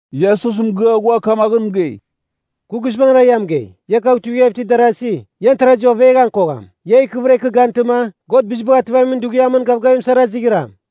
Iesus mɨgɨa ghua kamaghɨn mɨgei, “Kɨ guizbangɨra ia mɨgei, ia kagh tuivighav itir darasi, ian tarazi oveghan kogham. Ia ikɨvɨra ikɨ gantɨma, God Bizibagh Ativamin Dughiam gavgavim sara izighram.”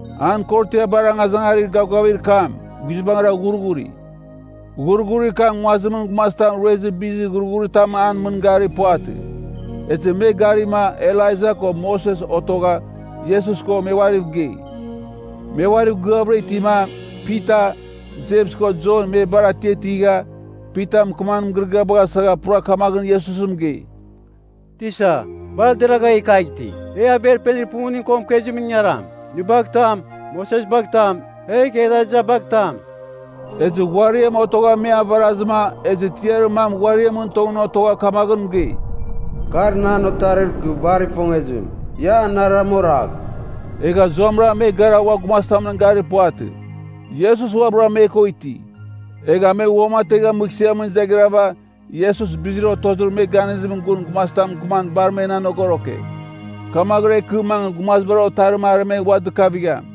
An korotiabar angazangarir gavgavir kam guizbangɨra ghurghuri. Ghurghurir kam nguazimɨn gumazitam ruezir bizir ghurghuritam an mɨn garir puvatɨ. Ezɨ me garima Elaija ko Moses otogha Iesus ko me uariv gei. Me uariv gɨavɨra itima, Pita, Jems ko Jon me bar atiatigha, Pita mɨkɨmamin mɨgɨrɨgɨabagh asagha pura kamaghɨn Iesus mɨgei, “Tisa, bar deragha e kagh iti! E averpenir pumuning ko mɨkezimɨn ingaram. Nɨ bagh tam, Moses bagh tam, egh Elaija bagh tam.” Ezɨ ghuariam otogha me avarazɨma ezɨ tiarir mam ghuariamɨn tongɨn otogha kamaghɨn mɨgei, “Kar nan Otarir kɨ bar ifongezim. Ia anarɨram oragh!” Egha zuamɨra me gara ua gumazitamɨn garir puvatɨ. Iesus uabɨra me ko iti. Egha me uamategha mɨghsɨamɨn izaghrava Iesus bizir otozir me ganizimɨn gun gumazitam mɨkɨman bar men anogoroke. Kamaghɨra ikɨ mangɨ Gumazibar Otarim aremegh ua dɨkavigham.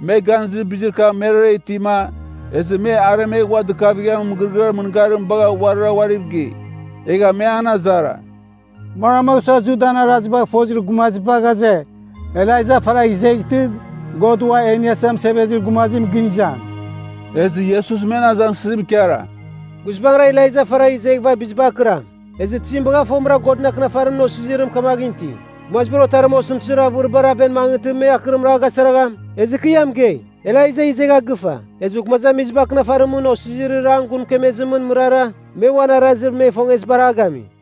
Me ganizir bizir kam merara itima, ezɨ me aremegh ua dɨkavighamin mɨgɨrɨgɨar mɨngarim bagha uarira uariv gei. Egha me an azara, “Manmagh sua Judan arazibagh fozir gumaziba ghaze, Elaija faragh izeghtɨ, God Ua e Iniasa Mɨsevezir Gumazim gɨn izam?” Ezɨ Iesus men azangsɨzim ikara, “Guizbangɨra Elaija faragh izeghɨva bizibar akɨram. Ezɨ tizim bagha fomɨra Godɨn Akɨnafarimɨn osizirim kamaghɨn iti, ‘Gumazibar Otarim osɨmtɨzir avɨribar aven mangɨtɨ me akɨrim a gasaragham?’ Ezɨ kɨ ia mɨgei, Elaija izegha gɨfa. Ezɨ gumazamiziba akɨnafarimɨn osizirir an gun mɨkemezimɨn mɨrara, me uan arazir me ifongezibar a gami.”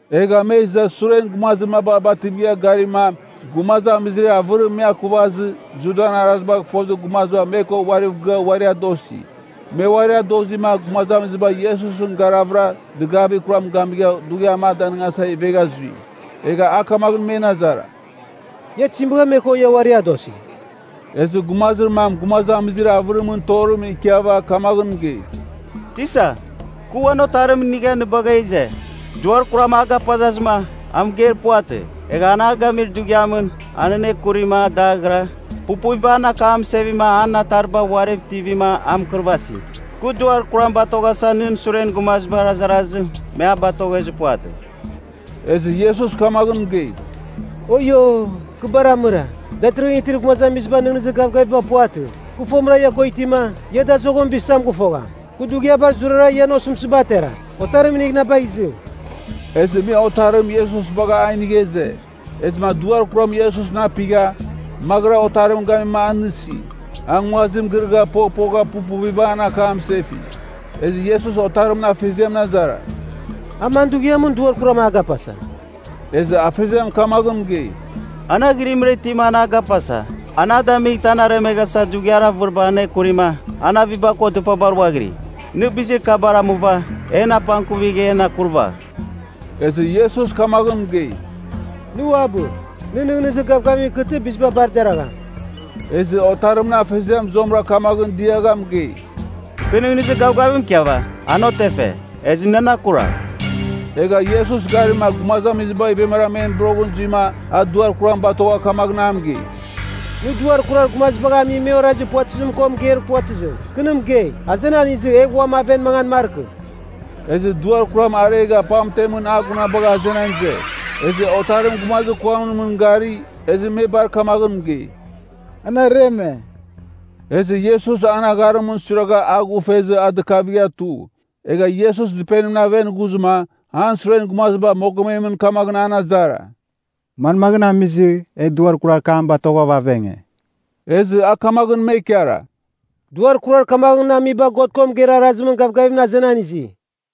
Egha me iza suren gumazir maba bativigha garima gumazamizir avɨrim me akuvazɨ Judan arazibagh fozir gumaziba me ko uariv gɨa uari adosi. Me uari adozima gumazamiziba Iesusɨn garavɨra dɨgavir kuram gamigha dughiam a danɨngasa ivegha zui. Egha a kamaghɨn men azara, “Ia tizim bagha me ko ia uari adosi?” Ezɨ gumazir mam gumazamizir avɨrimɨn torimɨn ikiava kamaghɨn mɨgei, “Tisa, kɨ uan otarim inigha nɨ bagha ize, duar kuram a gapazazɨma, a mɨgeir puvatɨ. Egha an a gamir dughiamɨn, an anekurima a daghira, pupuviba an akam mɨsevima an atariba uariv tivima a mɨkɨrvasi. Kɨ duar kuram batoghasa nɨn suren gumazibar azarazɨ me a batoghezir puvatɨ.” Ezɨ Iesus kamaghɨn mɨgei, “Oio! Kɨ bar amɨra, datɨrɨghɨn itir gumazamiziba nɨghnɨzir gavgaviba puvatɨ. Kɨ fomɨra ia ko itima, ia dazoghɨn bizitam gɨfogham? Kɨ dughiabar zurara ian osɨmtɨziba ateram? Otarim inigh na bagh izɨ.” Ezɨ me otarim Iesus bagha a inigha ize. Ezɨma duar kuram Iesusɨn apigha, maghɨra otarim gamima a nɨsi. A nguazim girɨgha poghpogha pupuviba an akam mɨsefi. Ezɨ Iesus otarimɨn afeziamɨn azara, “A man dughiamɨn duar kuram a gapasa?” Ezɨ afeziam kamaghɨn mɨgei, “An aghɨrimra itima an a gapasa. An a damightɨ an aremeghasa dughiar avɨribar anekurima an aviba ko dɨpabar ghuaghiri. Nɨ bizir kabar amuva, en apangkuvigh en akurvagh.” Ezɨ Iesus kamaghɨn mɨgei, “Nɨ uabɨ! Nɨ nɨghnɨzir gavgavim ikɨtɨ biziba bar deragham.” Ezɨ otarimɨn afeziam zuamɨra kamaghɨn diagha mɨgei, “Kɨ nɨghnɨzir gavgavim ikiava, an otefe. Ezɨ nɨ nan akuragh!” Egha Iesus garima gumazamiziba ivemara men boroghɨn zuima a duar kuram batogha kamaghɨn a mɨgei, “Nɨ duar kurar gumazibagh ami me orazi puvatɨzim ko mɨgeir puvatɨzim, kɨ nɨ mɨgei, azenan izɨ egh uam aven mangan markɨ!” Ezɨ duar kam aregha pamtemɨn a gunabagha azenan ize. Ezɨ otarim gumazir kuamɨn mɨn gari, ezɨ me bar kamaghɨn mɨgei, “An areme.” Ezɨ Iesus an agharimɨn suiragha a ghufezɨ a dɨkavigha tu. Egha Iesus dɨpenimɨn aven ghuzɨma an suren gumaziba mogomemɨn kamaghɨn an azara, “Manmagh amizɨ, e duar kurar kam batoghava avenge?” Ezɨ a kamaghɨn me ikara, “Duar kurar kamaghɨn amiba God ko mɨgeir arazimɨn gavgavimɨn azenan izi.”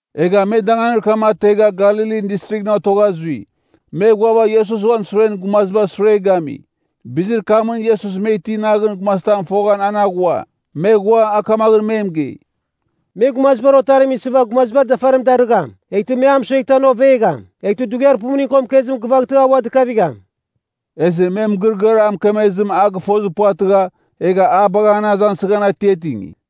Egha me danganir kam ategha Galilin Distrighɨn otogha zui. Me ghuava Iesus uan suren gumazibar sure gami. Bizir kamɨn Iesus me iti naghɨn gumazitam foghan an aghua. Me ghua, a kamaghɨn me mɨgei, “Me Gumazibar Otarim isɨva gumazibar dafarim darɨgham. Eghtɨ me a mɨsueghtɨ an ovegham. Eghtɨ dughiar pumuning ko mɨkezim gɨvaghtɨ a ua dɨkavigham.” Ezɨ me mɨgɨrɨgɨar a mɨkemezim a gɨfozir puvatɨgha, egha a bagha an azangsɨghan atiatingi.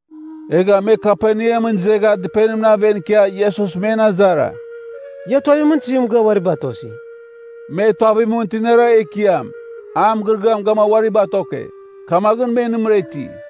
Egha me Kaperneamɨn izegha dɨpenimɨn aven ikia Iesus men azara, “Ia tuavimɨn tizim mɨgɨa uari batosi?” Me tuavimɨn tinara ekiam, a mɨgɨrɨgɨam gamua uari batoke. Kamaghɨn me nɨmɨra iti.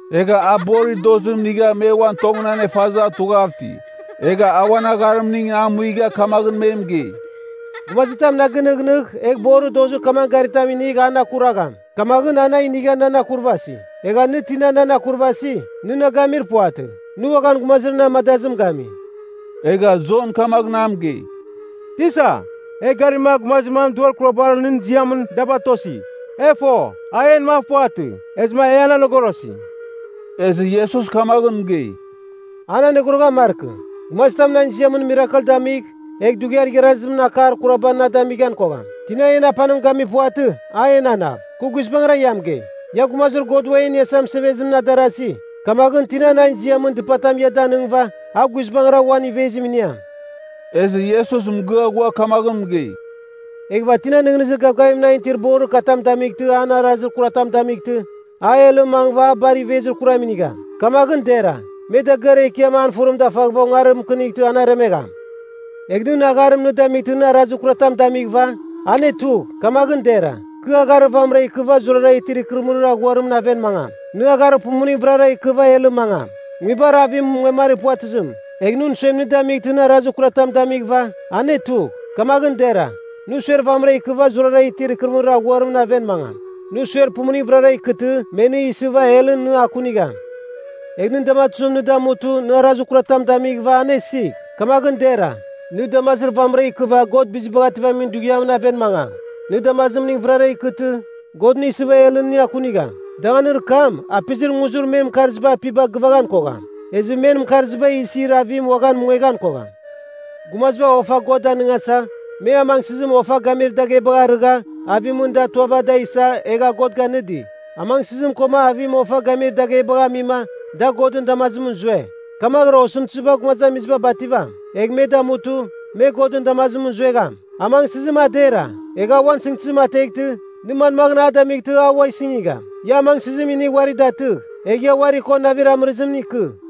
Egha a borir dozim inigha me uan tongɨn anefazɨ a tughav iti. Egha a uan agharimning a muigha kamaghɨn me mɨgei, “Gumazitam na gɨnɨghnɨgh egh borir dozir kamagh garitam inigh an akuragham, kamaghɨn a na inigha nan akurvasi. Egha nɨ tina nan akurvasi, nɨ na gamir puvatɨ. Nɨ uaghan gumazir na amadazim gami.” Egha Jon kamaghɨn a mɨgei, “Tisa, e garima gumazir mam duar kurabar nɨn ziamɨn da batosi. E fo, a en mav puvatɨ, ezɨma e an anogorosi.” Ezɨ Iesus kamaghɨn mɨgei, “An anogoroghan markɨ. Gumazitam nan ziamɨn mirakel damigh, egh dughiar igharazim akar kuraba na damighan kogham. Tina en apanim gami puvatɨ a enanav. Kɨ guizbangɨra ia mɨgei, ia Gumazir God Uam E Iniasa Mɨsevezimɨn adarasi. Kamaghɨn tina nan ziamɨn dɨpatam ia daningɨva a guizbangɨra uan ivezim iniam.” Iesus mɨgɨa ghua kamaghɨn mɨgei, “Eghɨva tina nɨghnɨzir gavgavim nan itir borir katam damightɨ an arazir kuratam damightɨ, a helɨn mangɨva, a bar ivezir kuram inigham. Kamaghɨn dera, me dagɨar ekiam an fɨrim dafaghɨva ongarim mɨkɨnightɨ an aremegham. Egh nɨn agharim nɨ damightɨ na arazir kuratam damighɨva, anetugh. Kamaghɨn dera, nɨ agharir vamɨra ikɨva zurara itir ikɨrɨmɨrir aghuarimɨn aven mangam. Nɨ agharir pumuning vɨrara ikɨva helɨn mangam, nguibar avim mungemari puvatɨzim. Egh nɨn suem nɨ damightɨ na arazir kuratam damighɨva, anetugh. Kamaghɨn dera, nɨ suer vamɨra ikɨva zurara itir ikɨrɨmɨrir aghuarimɨn aven mangam. Nɨ suer pumuning vɨrara ikɨtɨ me nɨ isɨva helɨn nɨ akunigham. Egh nɨn damatuzim nɨ damutɨ na arazir kuratam damighɨva anesigh. Kamaghɨn dera, nɨ damazir vamɨra ikɨva God Bizibagh Ativamin Dughiamɨn aven mangam. Nɨ damazimning vɨrara ikɨtɨ, God nɨ isɨva helɨn nɨ akunigham. Danganir kam ‘Apizir nguzir men mɨkarziba apiba gɨvaghan kogham. Ezɨ men mɨkarziba isir avim uaghan mungueghan kogham.’ “Gumaziba ofa God danɨngasa, me amangsɨzim ofa gamir daghebagh arɨgha avimɨn da tuava da isa, egha God ganɨdi. Amangsɨzim koma avim ofa gamir daghebagh amima da Godɨn damazimɨn zue. Kamaghɨra osɨmtɨziba gumazamiziba bativam. Egh me damutɨ, me Godɨn damazimɨn zuegham. Amangsɨzim a dera, egh a uan sɨngtɨzim ateghtɨ, nɨ manmaghɨn a damightɨ a ua sɨngigham? Ia amangsɨzim inigh uari datɨgh, egh ia uari ko navir amɨrɨzimɨn ikɨ.”